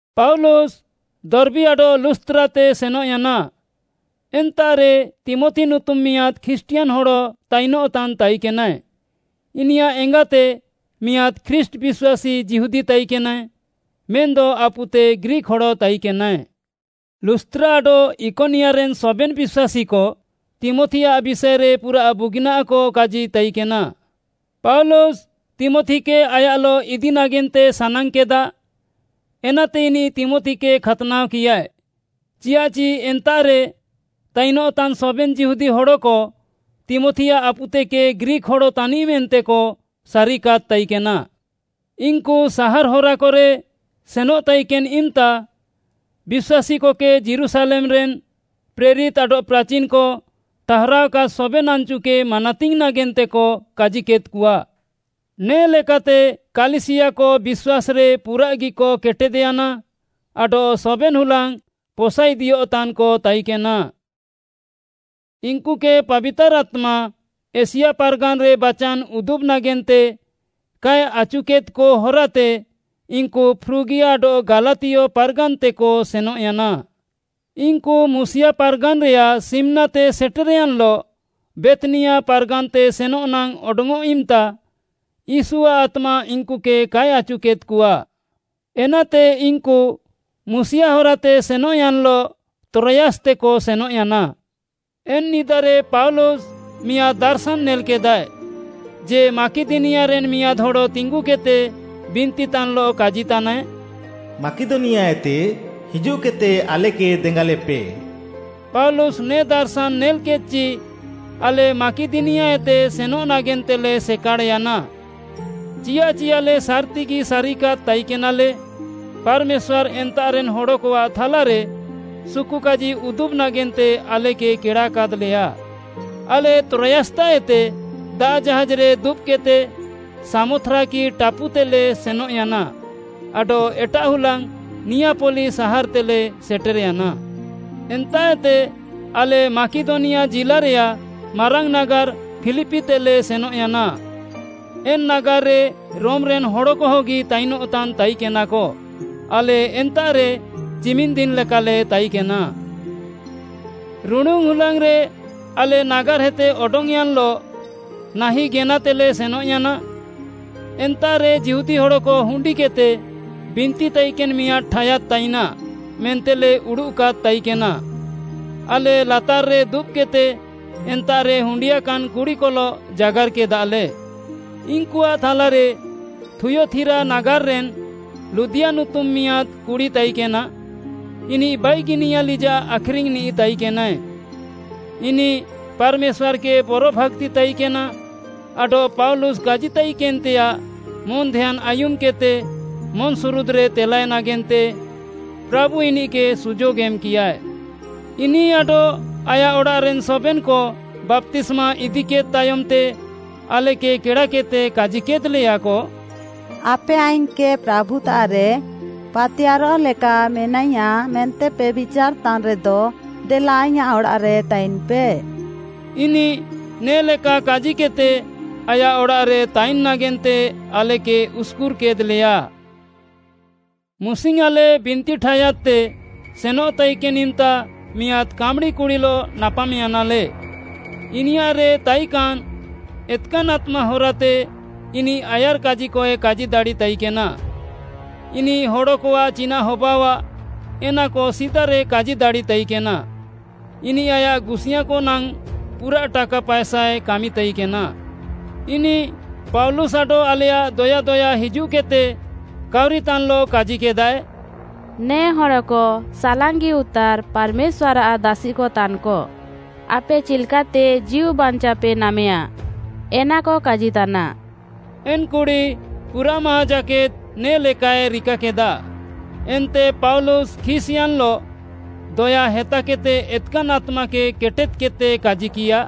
ପାଉଲୁସ୍‌ ଦର୍ବୀ ଆଡଃ ଲୁସ୍‌ତ୍ରାତେ ସେନଃୟାନା, ଏନ୍ତାଃରେ ତୀମଥି ନୁତୁମ୍‌ ମିଆଁଦ୍‌ ଖ୍ରୀଷ୍ଟିୟାନ୍‌ ହଡ଼ ତାଇନଃତାନ୍‌ ତାଇକେନାଏ। ଇନିୟାଃ ଏଙ୍ଗାତେ ମିଆଁଦ୍‌ ଖ୍ରୀଷ୍ଟ୍‌ ବିଶ୍ୱାସୀ ଯିହୁଦୀ ତାଇକେନାଏ, ମେନ୍‌ଦ ଆପୁତେ ଗ୍ରୀକ୍‌ ହଡ଼ ତାଇକେନାଏ। ଲୁସ୍‌ତ୍ରା ଆଡଃ ଇକନିୟାରେନ୍‌ ସବେନ୍‌ ବିଶ୍ୱାସୀକ ତୀମଥିଆଃ ବିଷାଏରେ ପୁରାଃ ବୁଗିନାଃକ କାଜି ତାଇକେନା। ପାଉଲୁସ୍‌, ତୀମଥିକେ ଆୟାଃଲଃ ଇଦି ନାଗେନ୍ତେ ସାନାଙ୍ଗ୍‌କେଦା, ଏନାତେ ଇନିଃ ତୀମଥିକେ ଖାତ୍‌ନାଅକିୟାଏ। ଚିଆଃଚି ଏନ୍ତାଃରେ ତାଇନଃତାନ୍‌ ସବେନ୍‌ ଯିହୁଦୀ ହଡ଼କ ତୀମଥିଆଃ ଆପୁତେକେ ଗ୍ରୀକ୍‌ ହଡ଼ ତାନିଃ ମେନ୍ତେକ ସାରିକାଦ୍‌ ତାଇକେନା। ଇନ୍‌କୁ ସାହାର୍‌ ହରାକରେ ସେନଃ ତାଇକେନ୍‌ ଇମ୍‌ତା, ବିଶ୍ୱାସୀକକେ ଯୀରୁଶାଲେମ୍‌ରେନ୍‌ ପ୍ରେରିତ୍‌ ଆଡଃ ପ୍ରାଚିନ୍‌କ ଠାହାରାଅକାଦ୍‌ ସବେନ୍‌ ଆନ୍‌ଚୁକେ ମାନାତିଙ୍ଗ୍‌ ନାଗେନ୍ତେକ କାଜିକେଦ୍‌କଆ। ନେ'ଲେକାତେ କାଲିସିୟାକ ବିଶ୍ୱାସ୍‌ରେ ପୁରାଃଗିକ କେଟେଦ୍‌ୟାନା ଆଡଃ ସବେନ୍‌ ହୁଲାଙ୍ଗ୍‌ ପସାଇଦିୟଃତାନ୍‌କ ତାଇକେନା। ଇନ୍‌କୁକେ ପାବିତାର୍‌ ଆତ୍ମା ଏସିଆ ପାର୍‌ଗାନ୍‌ରେ ବାଚାନ୍‌ ଉଦୁବ୍‌ ନାଗେନ୍ତେ କାଏ ଆଚୁକେଦ୍‌କ ହରାତେ ଇନ୍‌କୁ ଫ୍ରୁଗିଆ ଆଡଃ ଗାଲାତିୟ ପାର୍‌ଗାନ୍‌ତେକ ସେନଃୟାନା। ଇନ୍‌କୁ ମୁସିୟା ପାର୍‌ଗାନ୍‌ରେୟାଃ ସିମ୍‌ନାତେ ସେଟେର୍‌ୟାନ୍‌ଲଃ ବେଥ୍‌ନିଆ ପାର୍‌ଗାନ୍‌ତେ ସେନଃ ନାଙ୍ଗ୍‌ ଅଡଙ୍ଗ୍‌ଅଃ ଇମ୍‌ତା ୟୀଶୁଆଃ ଆତ୍ମା ଇନ୍‌କୁକେ କାଏ ଆଚୁକେଦ୍‌କଆ। ଏନାତେ ଇନ୍‌କୁ ମୁସିୟା ହରାତେ ସେନଃୟାନ୍‌ଲଃ ତ୍ରୋୟାସ୍‌ତେକ ସେନଃୟାନା। ଏନ୍‌ ନିଦାରେ ପାଉଲୁସ୍‌ ମିଆଁଦ୍‌ ଦାର୍‌ଶାନ୍‌ ନେଲ୍‌କେଦାଏ ଯେ, ମାକିଦନିଆରେନ୍‌ ମିଆଁଦ୍‌ ହଡ଼ ତିଙ୍ଗୁକେଦ୍‌ତେ ବିନ୍ତିତାନ୍‌ଲଃ କାଜିତାନାଏ, “ମାକିଦନିଆତେ ହିଜୁଃକେଦ୍‌ତେ ଆଲେକେ ଦେଙ୍ଗାଲେପେ!” ପାଉଲୁସ୍‌ ନେ ଦାର୍‌ଶାନ୍‌ ନେଲ୍‌କେଦ୍‌ଚି ଆଲେ ମାକିଦନିଆତେ ସେନଃ ନାଗେନ୍ତେଲେ ସେକାଡ଼୍‌ୟାନା, ଚିଆଃଚି ଆଲେ ସାର୍‌ତିଗି ସାରିକାଦ୍‌ ତାଇକେନାଲେ, ପାର୍‌ମେଶ୍ୱାର୍‌ ଏନ୍ତାଃରେନ୍‌ ହଡ଼କଆଃ ଥାଲାରେ ସୁକୁକାଜି ଉଦୁବ୍‌ ନାଗେନ୍ତେ ଆଲେକେ କେଡ଼ାକାଦ୍‌ଲେୟା। ଆଲେ ତ୍ରୋୟାସ୍‌ତାଃଏତେ ଦାଆଃ ଜାହାଜ୍‌ରେ ଦୁବ୍‌କେଦ୍‌ତେ ସାମଥ୍ରାକି ଟାପୁତେଲେ ସେନଃୟାନା, ଆଡଃ ଏଟାଃହୁଲାଙ୍ଗ୍‌ ନିୟାପଲି ସାହାର୍‌ତେଲେ ସେଟେର୍‌ୟାନା। ଏନ୍ତାଃଏତେ ଆଲେ ମାକିଦନିଆ ଜିଲ୍ଲାରେୟାଃ ମାରାଙ୍ଗ୍‌ ନାଗାର୍‌ ଫିଲିପିତେଲେ ସେନଃୟାନା। ଏନ୍‌ ନାଗାର୍‌ରେ ରୋମ୍‌ରେନ୍‌ ହଡ଼କହଗି ତାଇନଃତାନ୍‌ ତାଇକେନାକ। ଆଲେ ଏନ୍ତାଃରେ ଚିମିନ୍‌ଦିନ୍‌ ଲେକାଲେ ତାଇକେନା। ରୁଡ଼ୁନ୍‌ ହୁଲାଙ୍ଗ୍‌ରେ ଆଲେ ନାଗାର୍‌ହେତେ ଅଡଙ୍ଗ୍‌ୟାନ୍‌ଲଃ ନାହିଁ ଗେନାତେଲେ ସେନଃୟାନା। ଏନ୍ତାଃରେ ଯିହୁଦୀ ହଡ଼କ ହୁଣ୍ଡିକେଦ୍‌ତେ ବିନ୍ତି ତାଇକେନ୍‌ ମିଆଁଦ୍‌ ଠାୟାଦ୍‌ ତାଇନାଃ ମେନ୍ତେଲେ ଉଡ଼ୁଃକାଦ୍‌ ତାଇକେନା। ଆଲେ ଲାତାର୍‌ରେ ଦୁବ୍‌କେଦ୍‌ତେ ଏନ୍ତାଃରେ ହୁଣ୍ଡିୟାକାନ୍‌ କୁଡ଼ିକଲଃ ଜାଗାର୍‌କେଦାଲେ। ଇନ୍‌କୁଆଃ ଥାଲାରେ ଥୁୟତିରା ନାଗାର୍‌ରେନ୍‌ ଲୁଦିୟା ନୁତୁମ୍‌ ମିଆଁଦ୍‌ କୁଡ଼ି ତାଇକେନା। ଇନିଃ ବାଇଗିନିଆ ଲିଜାଃ ଆଖ୍‌ରିଙ୍ଗ୍‌ନିଃ ତାଇକେନାଏ। ଇନିଃ ପାର୍‌ମେଶ୍ୱାର୍‌କେ ବରଭାକ୍ତି ତାଇକେନା ଆଡଃ ପାଉଲୁସ୍‌ କାଜିତାଇକେନ୍‌ତେୟାଃ ମନ୍‌ଧ୍ୟାନ୍‌ ଆୟୁମ୍‌କେଦ୍‌ତେ ମନ୍‌ସୁରୁଦ୍‌ରେ ତେଲାଏ ନାଗେନ୍ତେ ପ୍ରାଭୁ ଇନିଃକେ ସୁଯୋଗ୍‌ ଏମ୍‌କିୟାଏ। ଇନିଃ ଆଡଃ ଆୟାଃ ଅଡ଼ାଃରେନ୍‌ ସବେନ୍‌କ ବାପ୍ତିସ୍ମା ଇଦିକେଦ୍‌ ତାୟମ୍‌ତେ ଆଲେକେ କେଡ଼ାକେଦ୍‌ତେ କାଜିକେଦ୍‌ଲେୟାକ, “ଆପେ ଆଇଙ୍ଗ୍‌କେ ପ୍ରାଭୁତାଃରେ ପାତିୟାର୍‌ରଃ ଲେକା ମେନାଇୟା ମେନ୍ତେପେ ବିଚାର୍‌ତାନ୍‌ ରେଦ, ଦେଲା ଆଇଁୟାଃ ଅଡ଼ାଃରେ ତାଇନ୍‌ପେ।” ଇନିଃ ନେ'ଲେକା କାଜିକେଦ୍‌ତେ ଆୟାଃ ଅଡ଼ାଃରେ ତାଇନ୍‌ ନାଗେନ୍ତେ ଆଲେକେ ଉସ୍‌କୁର୍‌କେଦ୍‌ଲେୟା। ମୁସିଙ୍ଗ୍‌ ଆଲେ ବିନ୍ତି ଠାୟାଦ୍‌ତେ ସେନଃ ତାଇକେନ୍‌ ଇମ୍‌ତା ମିଆଁଦ୍‌ କାମ୍‌ଡ଼ି କୁଡ଼ିଲଃ ନାପାମ୍‌ୟାନାଲେ। ଇନିୟାଃରେ ତାଇକାନ୍‌ ଏତ୍‌କାନ୍‌ ଆତ୍ମା ହରାତେ ଇନିଃ ଆୟାର୍‌କାଜିକଏ କାଜି ଦାଡ଼ିତାଇକେନା। ଇନିଃ ହଡ଼କଆଃ ଚିନାଃ ହବାଅଃଆ ଏନାକ ସିଦାରେ କାଜି ଦାଡ଼ି ତାଇକେନା। ଇନିଃ ଆୟାଃ ଗୁସିୟାଁକଆଃ ନାଙ୍ଗ୍‌ ପୁରାଃ ଟାକା ପାଏସାଏ କାମି ତାଇକେନା। ଇନିଃ ପାଉଲୁସ୍‌ ଆଡଃ ଆଲେୟାଃ ଦୟା ଦୟା ହିଜୁଃକେଦ୍‌ତେ କାଉରିତାନ୍‌ଲଃ କାଜିକେଦାଏ, “ନେ ହଡ଼କ ସାଲାଙ୍ଗି ଉତାର୍‌ ପାର୍‌ମେଶ୍ୱାର୍‌ଆଃ ଦାସିକ ତାନ୍‌କ। ଆପେ ଚିଲ୍‌କାତେ ଜୀଉବାଞ୍ଚାଅପେ ନାମେୟା, ଏନାକ କାଜିତାନା।” ଏନ୍‌ କୁଡ଼ି ପୁରାଃ ମାହାଁ ଜାକେଦ୍‌ ନେ'ଲେକାଏ ରିକାକେଦା। ଏନ୍ତେ ପାଉଲୁସ୍‌ ଖିସ୍‌ୟାନ୍‌ଲଃ ଦୟା ହେତାକେଦ୍‌ତେ ଏତ୍‌କାନ୍‌ ଆତ୍ମାକେ କେଟେଦ୍‌କେଦ୍‌ତେ କାଜିକିୟା,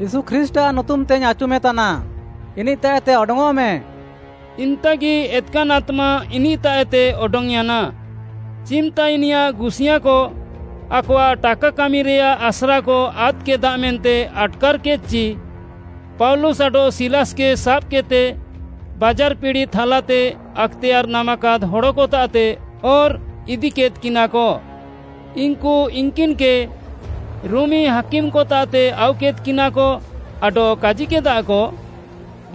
“ୟୀଶୁ ଖ୍ରୀଷ୍ଟ୍‌ଆଃ ନୁତୁମ୍‌ତେଇଙ୍ଗ୍‌ ଆଚୁମେତାନା, ଇନିଃତାଃଏତେ ଅଡଙ୍ଗ୍‌ଅଃମେ!” ଇମ୍‌ତାଗି ଏତ୍‌କାନ୍‌ ଆତ୍ମା ଇନିଃତାଃଏତେ ଅଡଙ୍ଗ୍‌ୟାନା। ଚିମ୍‌ତା ଇନିୟାଃ ଗୁସିୟାଁକ ଆକଆଃ ଟାକା କାମିରେୟାଃ ଆସ୍ରାକ ଆଦ୍‌କେଦା ମେନ୍ତେ ଆଟ୍‌କାର୍‌କେଦ୍‌ଚି, ପାଉଲୁସ୍‌ ଆଡଃ ସିଲାସ୍‌କେ ସାବ୍‌କେଦ୍‌ତେ ବାଜାର୍‌ ପିଡ଼ି ଥାଲାତେ ଆକ୍‌ତେୟାର୍‌ ନାମାକାଦ୍‌ ହଡ଼କତାଃତେ ଅର୍‌ ଇଦିକେଦ୍‌କିନାକ। ଇନ୍‌କୁ ଇନ୍‌କିନ୍‌କେ ରୋମି ହାକିମ୍‍କତାଃତେ ଆଉକେଦ୍‍କିନାକ ଆଡଃ କାଜିକେଦାକ,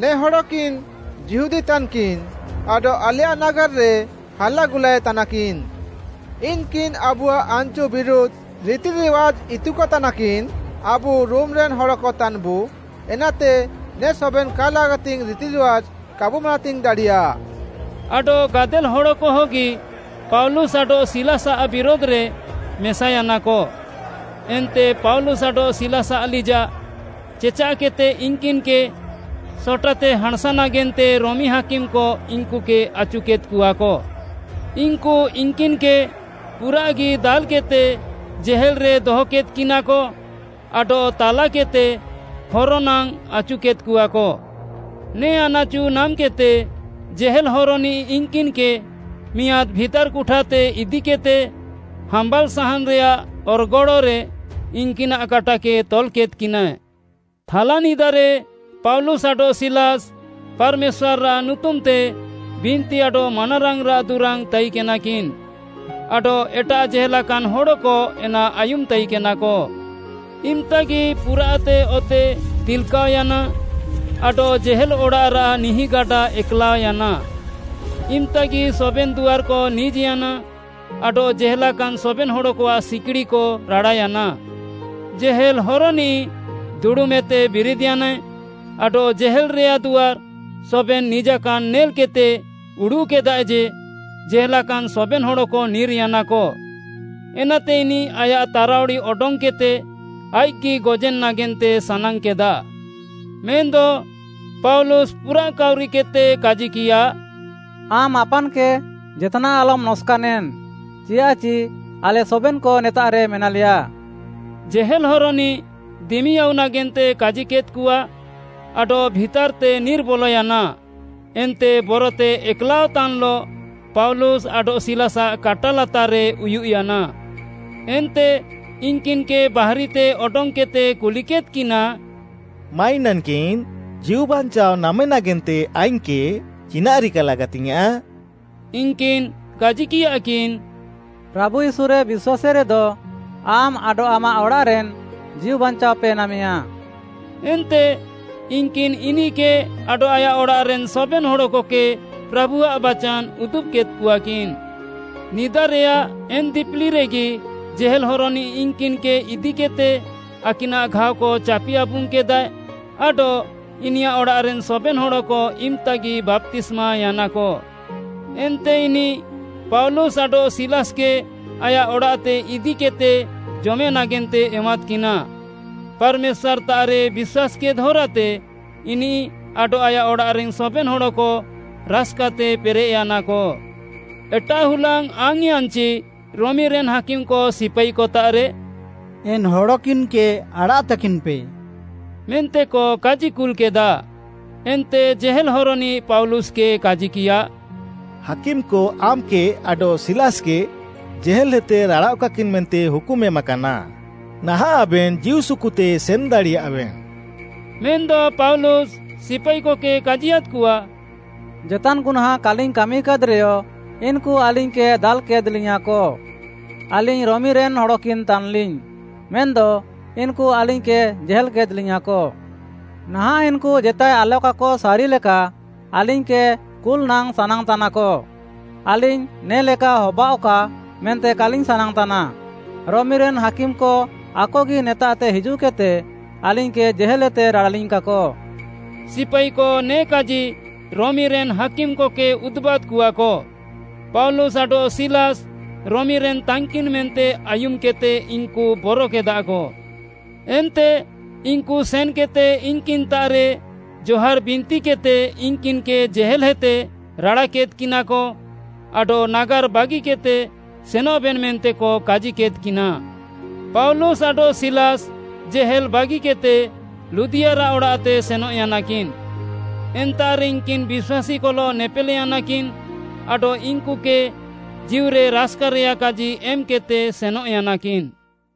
“ନେ ହଡ଼କିନ୍‌ ଯିହୁଦୀ ତାନ୍‌କିନ୍‌, ଆଡଃ ଆଲେୟାଃ ନାଗାର୍‌ରେ ହାଲାଗୁଲାଏ ତାନାକିନ୍‌। ଇନ୍‌କିନ୍‌ ଆବୁଆଃ ଆନ୍‌ଚୁ ବିରୁଧ୍‌ ରିତିରିୱାଜ୍‌ ଇତୁକତାନାକିନ୍‌। ଆବୁ ରୋମିରେନ୍‌ ହଡ଼କ ତାନ୍‌ବୁ, ଏନାତେ ନେ ସବେନ୍‌ କା ଲାଗାତିଙ୍ଗ୍‌ ରିତିରିୱାଜ୍‌ କାବୁ ମାନାତିଙ୍ଗ୍‌ ଦାଡ଼ିୟା।” ଆଡଃ ଗାଦେଲ୍‌ ହଡ଼କହଗି ପାଉଲୁସ୍‌ ଆଡଃ ସିଲାସ୍‌ଆଃ ବିରୁଧ୍‌ରେ ମେସାୟାନାକ। ଏନ୍ତେ ପାଉଲୁସ୍‌ ଆଡଃ ସିଲାସ୍‌ଆଃ ଲିଜାଃ ଚେଚାଃକେଦ୍‌ତେ ଇନ୍‌କିନ୍‌କେ ସଟାତେ ହାଁଣ୍‌ସା ନାଗେନ୍ତେ ରୋମି ହାକିମ୍‌କ ଇନ୍‌କୁକେ ଆଚୁକେଦ୍‌କଆକ। ଇନ୍‌କୁ ଇନ୍‌କିନ୍‌କେ ପୁରାଃଗି ଦାଲ୍‌କେଦ୍‌ତେ ଜେହେଲ୍‌ରେ ଦହକେଦ୍‌କିନାକ ଆଡଃ ତାଲାକେଦ୍‌ତେ ହର ନାଙ୍ଗ୍‌ ଆଚୁକେଦ୍‌କଆକ। ନେ ଆନାଚୁ ନାମ୍‌କେଦ୍‌ତେ ଜେହେଲ୍‌ ହରନିଃ ଇନ୍‌କିନ୍‌କେ ମିଆଁଦ୍‌ ଭିତାର୍‌ କୁଠାତେ ଇଦିକେଦ୍‌ତେ ହାମ୍ବାଲ୍‌ ସାହାନ୍‌ରେୟାଃ ଅର୍‌ଗଡ଼୍‌ରେ ଇନ୍‌କିନାଃ କାଟାକେ ତଲ୍‌କେଦ୍‌କିନାଏ। ଥାଲାନିଦାରେ ପାଉଲୁସ୍‌ ଆଡଃ ସିଲାସ୍‌ ପାର୍‌ମେଶ୍ୱାର୍‌ଆଃ ନୁତୁମ୍‌ତେ ବିନ୍ତି ଆଡଃ ମାନାରାଙ୍ଗ୍‌ରାଃ ଦୁରାଙ୍ଗ୍‌ ତାଇକେନାକିନ୍‌ ଆଡଃ ଏଟାଃ ଜେହେଲାକାନ୍‌ ହଡ଼କ ଏନା ଆୟୁମ୍‌ ତାଇକେନାକ। ଇମ୍‍ତାଗି ପୁରାଃତେ ଅତେ ଦିଲ୍‌କାଅୟାନା ଆଡଃ ଜେହେଲ୍‌ ଅଡ଼ାଃରାଃ ନିହିଁଗାଡ଼ା ଏକ୍‌ଲାଅୟାନା। ଇମ୍‍ତାଗି ସବେନ୍‌ ଦୁଆର୍‌କ ନିଜ୍‌ୟାନା ଆଡଃ ଜେହେଲାକାନ୍‌ ସବେନ୍‍ ହଡ଼କଆଃ ସିକିଡ଼ିକ ରାଡ଼ାୟାନା। ଜେହେଲ୍ ହରନିଃ ଦୁଡ଼ୁମ୍‌ଏତେ ବିରିଦ୍‌ୟାନାଏ ଆଡଃ ଜେହେଲ୍‌ରେୟାଃ ଦୁଆର୍‌ ସବେନ୍‌ ନିଜାକାନ୍‌ ନେଲ୍‌କେଦ୍‌ତେ ଉଡ଼ୁଃକେଦାଏ ଯେ, ଜେହେଲାକାନ୍‌ ସବେନ୍‌ ହଡ଼କ ନିର୍‌ୟାନାକ। ଏନାତେ ଇନିଃ ଆୟାଃ ତାରାଉଡ଼ି ଅଡଙ୍ଗ୍‌କେଦ୍‌ତେ ଆଇଃକ୍‌ଗି ଗଜେନ୍‌ ନାଗେନ୍ତେ ସାନାଙ୍ଗ୍‌କେଦା। ମେନ୍‌ଦ ପାଉଲୁସ୍‌ ପୁରାଃ କାଉରିକେଦ୍‍ତେ କାଜିକିୟା, “ଆମ୍‌ ଆପାନ୍‌କେ ଜେତ୍‌ନାଃ ଆଲମ୍‌ ନକ୍‌ସାନେନ୍‌ ଚିଆଃଚି ଆଲେ ସବେନ୍‌କ ନେତାଃରେ ମେନାଲେୟା।” ଜେହେଲ୍‌ ହରନିଃ ଦିମି ଆଉ ନାଗେନ୍ତେ କାଜିକେଦ୍‌କଆ ଆଡଃ ଭିତାର୍‌ତେ ନିର୍‌ବଲୟାନା ଏନ୍ତେ ବରତେ ଏକ୍‌ଲାଅଃତାନ୍‌ଲଃ ପାଉଲୁସ୍‌ ଆଡଃ ସିଲାସ୍‌ଆଃ କାଟା ଲାତାର୍‌ରେ ଉୟୁଃୟାନା। ଏନ୍ତେ ଇନ୍‌କିନ୍‌କେ ବାହାରିତେ ଅଡଙ୍ଗ୍‌କେଦ୍‌ତେ କୁଲିକେଦ୍‌କିନା, “ମାଇନାନ୍‌କିନ୍‌, ଜୀଉବାଞ୍ଚାଅ ନାମେ ନାଗେନ୍ତେ ଆଇଙ୍ଗ୍‌କେ ଚିନାଃ ରିକା ଲାଗାତିଙ୍ଗ୍‌ୟାଁଃ?” ଇନ୍‌କିନ୍‌ କାଜିକିୟାକିନ୍‌, “ପ୍ରାଭୁ ୟୀଶୁରେ ବିଶ୍ୱାସେରେଦ, ଆମ୍‌ ଆଡଃ ଆମାଃ ଅଡ଼ାଃରେନ୍‌ ଜୀଉବାଞ୍ଚାଅପେ ନାମେୟା।” ଏନ୍ତେ ଇନ୍‌କିନ୍‌ ଇନିଃକେ ଆଡଃ ଆୟାଃ ଅଡ଼ାଃରେନ୍‌ ସବେନ୍‌ ହଡ଼କକେ ପ୍ରାଭୁଆଃ ବାଚାନ୍‌ ଉଦୁବ୍‌କେଦ୍‌କଆକିନ୍‌। ନିଦାରେୟାଃ ଏନ୍‌ ଦିପିଲିରେଗି ଜେହେଲ୍‌ ହରନିଃ ଇନ୍‌କିନ୍‌କେ ଇଦିକେଦ୍‌ତେ, ଆକିନାଃ ଘାଅକ ଚାପି ଆବୁଙ୍ଗ୍‌କେଦାଏ, ଆଡଃ ଇନିୟାଃ ଅଡ଼ାଃରେନ୍‌ ସବେନ୍‌ ହଡ଼କ ଇମ୍‌ତାଗି ବାପ୍ତିସ୍ମାୟାନାକ। ଏନ୍ତେ ଇନିଃ ପାଉଲୁସ୍‌ ଆଡଃ ସିଲାସ୍‌କେ ଆୟାଃ ଅଡ଼ାଃତେ ଇଦିକେଦ୍‌ତେ ଜମେ ନାଗେନ୍ତେ ଏମାଦ୍‌କିନା। ପାର୍‌ମେଶ୍ୱାର୍‌ତାଃରେ ବିଶ୍ୱାସ୍‌କେଦ୍‌ ହରାତେ ଇନିଃ ଆଡଃ ଆୟାଃ ଅଡ଼ାଃରେନ୍‌ ସବେନ୍‌ ହଡ଼କ ରାସ୍‌କାତେ ପେରେଃୟାନାକ। ଏଟାଃ ହୁଲାଙ୍ଗ୍‌ ଆଙ୍ଗ୍‌ୟାନ୍‍ଚି ରୋମିରେନ୍‌ ହାକିମ୍‍କ ସିପାଇକତାଃରେ, “ଏନ୍‌ ହଡ଼କିନ୍‌କେ ଆଡ଼ାଃତାକିନ୍‌ପେ” ମେନ୍ତେକ କାଜିକୁଲ୍‍କେଦା। ଏନ୍ତେ ଜେହେଲ୍‌ ହରନିଃ ପାଉଲୁସ୍‌କେ କାଜିକିୟା, “ହାକିମ୍‌କ ଆମ୍‌କେ ଆଡଃ ସିଲାସ୍‌କେ ଜେହେଲ୍‌ହେତେ ରାଡ଼ାଃଅକାକିନ୍‌ ମେନ୍ତେ ହୁକୁମ୍‌ ଏମାକାନା। ନାହାଁଃ ଆବେନ୍‌ ଜୀଉସୁକୁତେ ସେନ୍‌ ଦାଡ଼ିୟାଃବେନ୍‌।” ମେନ୍‌ଦ ପାଉଲୁସ୍‌ ସିପାଇକକେ କାଜିୟାଦ୍‍କଆ, “ଜେତାନ୍‌ ଗୁହ୍ନାଁଁ କାଲିଙ୍ଗ୍‌ କାମିକାଦ୍‌ରେୟ ଇନ୍‌କୁ ଆଲିଙ୍ଗ୍‌କେ ଦାଲ୍‌କାଦ୍‌ଲିୟାଁକ। ଆଲିଙ୍ଗ୍‌ ରୋମିରେନ୍‌ ହଡ଼କିନ୍ ତାନ୍‍ଲିଙ୍ଗ୍‌, ମେନ୍‌ଦ ଇନ୍‌କୁ ଆଲିଙ୍ଗ୍‌କେ ଜେହେଲ୍‌କେଦ୍‌ଲିୟାଁକ। ନାହାଁଃ ଇନ୍‌କୁ ଜେତାଏ ଆଲକାକ ସାରିଲେକା ଆଲିଙ୍ଗ୍‌କେ କୁଲ୍‌ନାଙ୍ଗ୍‌ ସାନାଙ୍ଗ୍‌ତାନାକ। ଆଲିଙ୍ଗ୍‌ ନେ'ଲେକା ହବାଅଃକା ମେନ୍ତେ କାଲିଙ୍ଗ୍‌ ସାନାଙ୍ଗ୍‌ତାନା। ରୋମିରେନ୍‌ ହାକିମ୍‌କ ଆକଗି ନେତାଃତେ ହିଜୁଃକେଦ୍‌ତେ ଆଲିଙ୍ଗ୍‌କେ ଜେହେଲ୍‌ହେତେ ରାଡ଼ାଲିଙ୍ଗ୍‌କାକ।” ସିପାଇକ ନେ କାଜି ରୋମିରେନ୍‌ ହାକିମ୍‍କକେ ଉଦୁବାଦ୍‌କଆକ। ପାଉଲୁସ୍‌ ଆଡଃ ସିଲାସ୍‌ ରୋମିରେନ୍‌ ତାନ୍‌କିନ୍‌ ମେନ୍ତେ ଆୟୁମ୍‌କେଦ୍‌ତେ ଇନ୍‌କୁ ବରକେଦାକ। ଏନ୍ତେ ଇନ୍‌କୁ ସେନ୍‌କେଦ୍‌ତେ ଇନ୍‌କିନ୍‌ତାଃରେ ଜହାର୍‌ ବିନ୍ତିକେଦ୍‌ତେ ଇନ୍‌କିନ୍‌କେ ଜେହେଲ୍‌ହେତେ ରାଡ଼ାକେଦ୍‌କିନାକ ଆଡଃ ନାଗାର୍‌ ବାଗିକେଦ୍‌ତେ ସେନଃବେନ୍‌ ମେନ୍ତେକ କାଜିକେଦ୍‌କିନା। ପାଉଲୁସ୍‌ ଆଡଃ ସିଲାସ୍‌ ଜେହେଲ୍‌ ବାଗିକେଦ୍‌ତେ ଲୁଦିୟାରାଃ ଅଡ଼ାଃତେ ସେନଃୟାନାକିନ୍‌। ଏନ୍ତାଃରେ ଇନ୍‌କିନ୍‌ ବିଶ୍ୱାସୀକଲଃ ନେପେଲ୍‌ୟାନାକିନ୍‌ ଆଡଃ ଇନ୍‌କୁକେ ଜୀଉରେ ରାସ୍‌କାରେୟାଃ କାଜି ଏମ୍‌କେଦ୍‌ତେ ସେନଃୟାନାକିନ୍‌।